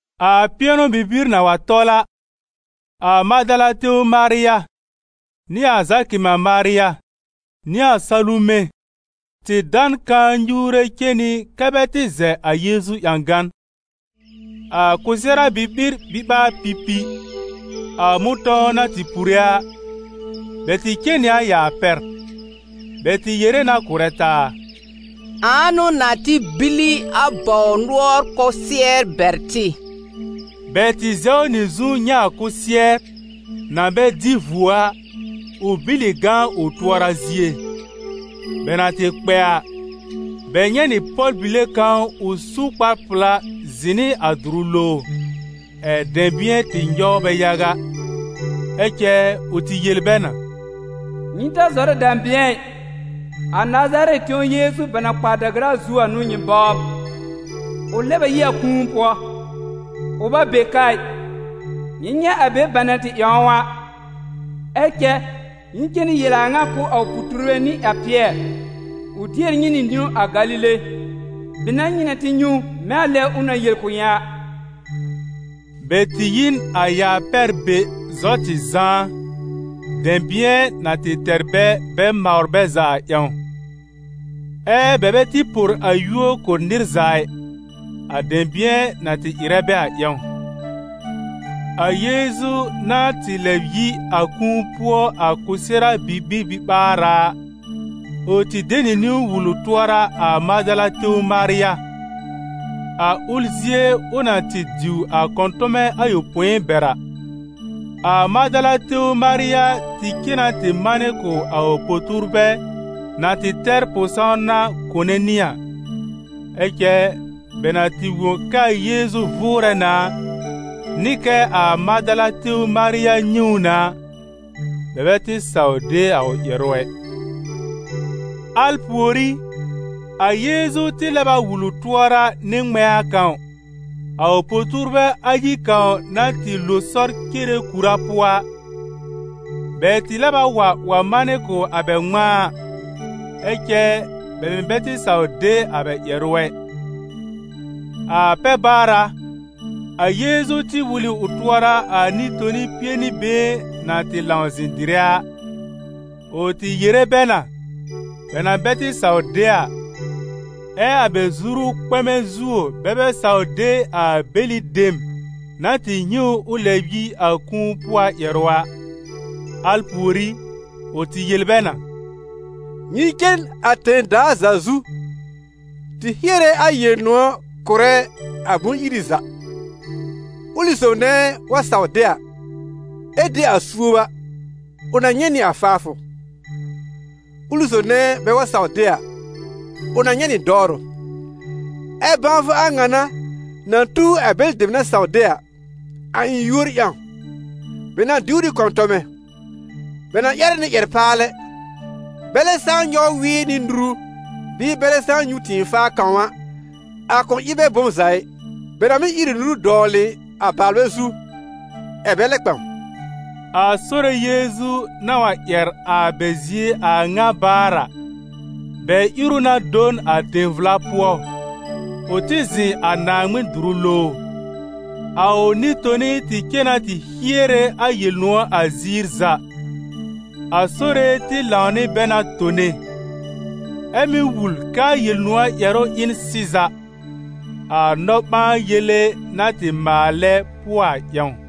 A pɩɛnʋ-bibir na wa tɔl a, a Madala tẽw Marya, nɩ a Zakɩ mã Marya, nɩ a Salume, tɩ da n kãa-nyuure cen nɩ kɛ bɛ tɩ zɛ a Yeezu ƴãgan. A kɔsɩɛra bibir biɓaar-pipi, a mʋ̃tɔ̃w na tɩ pure a, bɛ tɩ cen nɩ a yaa pɛr. Bɛ tɩ yere na kʋ̀rɛ taa: «Ãa n'ʋ na tɩ bìlì a bɔw nʋɔr kʋsɩɛr bɛr tɩ?» Bɛ tɩ zɛw nɩ zu nyɛ̃ a kʋsɩɛr, na bɛ dɩ vuo a, ʋ bìlì gã ʋ tʋɔra zie. Bɛ na tɩ kpɛ a, bɛ nyɛ̃ nɩ pɔl bile kãw ʋ su kpar-pla zɩ̃ nɩ a dʋrʋ lowr, ɛ̀ dɛ̃bɩ̃ɛ tɩ nyɔw bɛ yaga. Ɛ cɛ ʋ tɩ yel bɛ na: «Nyɩ ta zɔrɛ dɛ̃bɩ̃ɛ ɩ, a Nazarɛtɩ tẽw Yeezu bɛ na kpa a da-gara zu a n'ʋ nyɩ bɔbr, ʋ lɛb a yi a kũu pʋɔ, ʋ bɛ be ka ɩ. Nyɩ nyɛ̃ a be bɛ na tɩ ƴãw ʋ a. Ɛ cɛ nyɩ cen tɩ yel a ŋa kʋ̀ a ʋ po-tuurbɛ nɩ a Pɩɛr: ʋ dier nyɩ nɩ niwn a Galile, be n'a nyɩ na tɩ nyɛ̃ ʋ mɛ̃ a lɛ ʋ na yel kʋ̀ nyɩ a.» Bɛ tɩ yi n a yaa pɛr be zɔ tɩ zãá, dɛ̃bɩ̃ɛ na tɩ tɛr bɛ bɛ mawr bɛ za a ƴãw. Ɛ bɛ bɛ tɩ por a yúor kʋ̀ nɩr za ɩ, a dɛ̃bɩ̃ɛ na tɩ ɩrɛ bɛ a ƴãw. [ A Yeezu na tɩ lɛb yi a kũu pʋɔ a kɔsɩɛra bibir biɓaara a, ʋ tɩ de nɩ niwn wul ʋ tʋɔra a Madala tẽw Marya, a ʋl zie ʋ na tɩ diw a kɔ̃tɔmɛ ayopõi bɛr a. A Madala tẽw Marya tɩ cen na tɩ manɩ kʋ̀ a ʋ po-tuurbɛ na tɩ tɛr pʋ-sãwna kone nɩ a. Ɛ cɛ bɛ na tɩ wõ kɛ a Yeezu vʋʋrɛ na a, nɩ kɛ a Madala tẽw Marya nyɛ̃ ʋ na a, bɛ bɛ tɩ saw de a ʋ ƴɛrʋ ɛ. Al pùorí, a Yeezu tɩ lɛb a wul ʋ tʋɔra nɩ ŋmɛ̃a kãw, a ʋ po-tuurbɛ ayi kãw na tɩ lo sɔr cere kura pʋɔ a. Bɛ tɩ lɛb a wa wa manɩ kʋ̀ a bɛ ŋmãa, ɛ cɛ bɛ mɩ̀ bɛ tɩ saw de a bɛ ƴɛrʋ ɛ. A pɛ-baara a, a Yeezu tɩ wul ɩ ʋ tʋɔra a Nɩ-toni pie nɩ been na tɩ lãw zɩ̃ dɩrɛ a. Ʋ tɩ yere bɛ na, bɛ na bɛ tɩ saw de a, ɛ a bɛ zuru kpɛmɛ zuo bɛ bɛ saw de a bɛlɩ dem na tɩ nyɛ̃ ʋ ʋ lɛb yi a kũu pʋɔ a ƴɛrʋ a. Al pùorí, ʋ tɩ yel bɛ na: «Nyɩ cen a tẽ-daa za zu tɩ hiere a Yel-nʋ̃ɔ̀ kʋ̀rɛ a bʋ̃-iri za. Ʋlɩ sob nɛ wa saw de a, ɛ de a suob a, ʋ na nyɛ̃ nɩ a faafʋ; ʋlɩ sob nɛ bɛ wa saw de a, ʋ na nyɛ̃ nɩ dɔwrʋ. Ɛ bãwfʋ a ŋa n'a na tuur a bɛlɩ dem na saw de a: a ɩ̃ yúor ƴãw, bɛ na diwr ɩ kɔ̃tɔmɛ; bɛ na ƴɛrɛ nɩ ƴɛr-paalɛ; bɛlɛ saa nyɔw wɩɩr nɩ nuru bɩɩ bɛlɛ saa nyũ tɩ̃ɩ faa kãw a, a kʋ̃ ɩ bɛ bom za ɩ. Bɛ na mɩ́ ír ɩ nuru dɔwlɩ a baalbɛ zu, ɛ̀ bɛ lɛb kpɛ̃w.» A Sore Yeezu na wa ƴɛr a bɛ zie a a ŋa baar a, bɛ ír ʋ na do n a tẽ-vla pʋɔ, ʋ tɩ zɩ̃ a Naaŋmɩn dʋrʋ lowr. A ʋ Nɩ-toni tɩ cen na tɩ hiere a Yel-nʋ̃ɔ̀ a ziir za. A Sore tɩ lãw nɩ bɛ na tone, ɛ mɩ́ wul kɛ a Yel-nʋ̃ɔ̀ ƴɛrʋ ɩ n sɩza, a nɔ-ɓãa-yele na tɩ maalɛ pʋɔ a ƴãw.]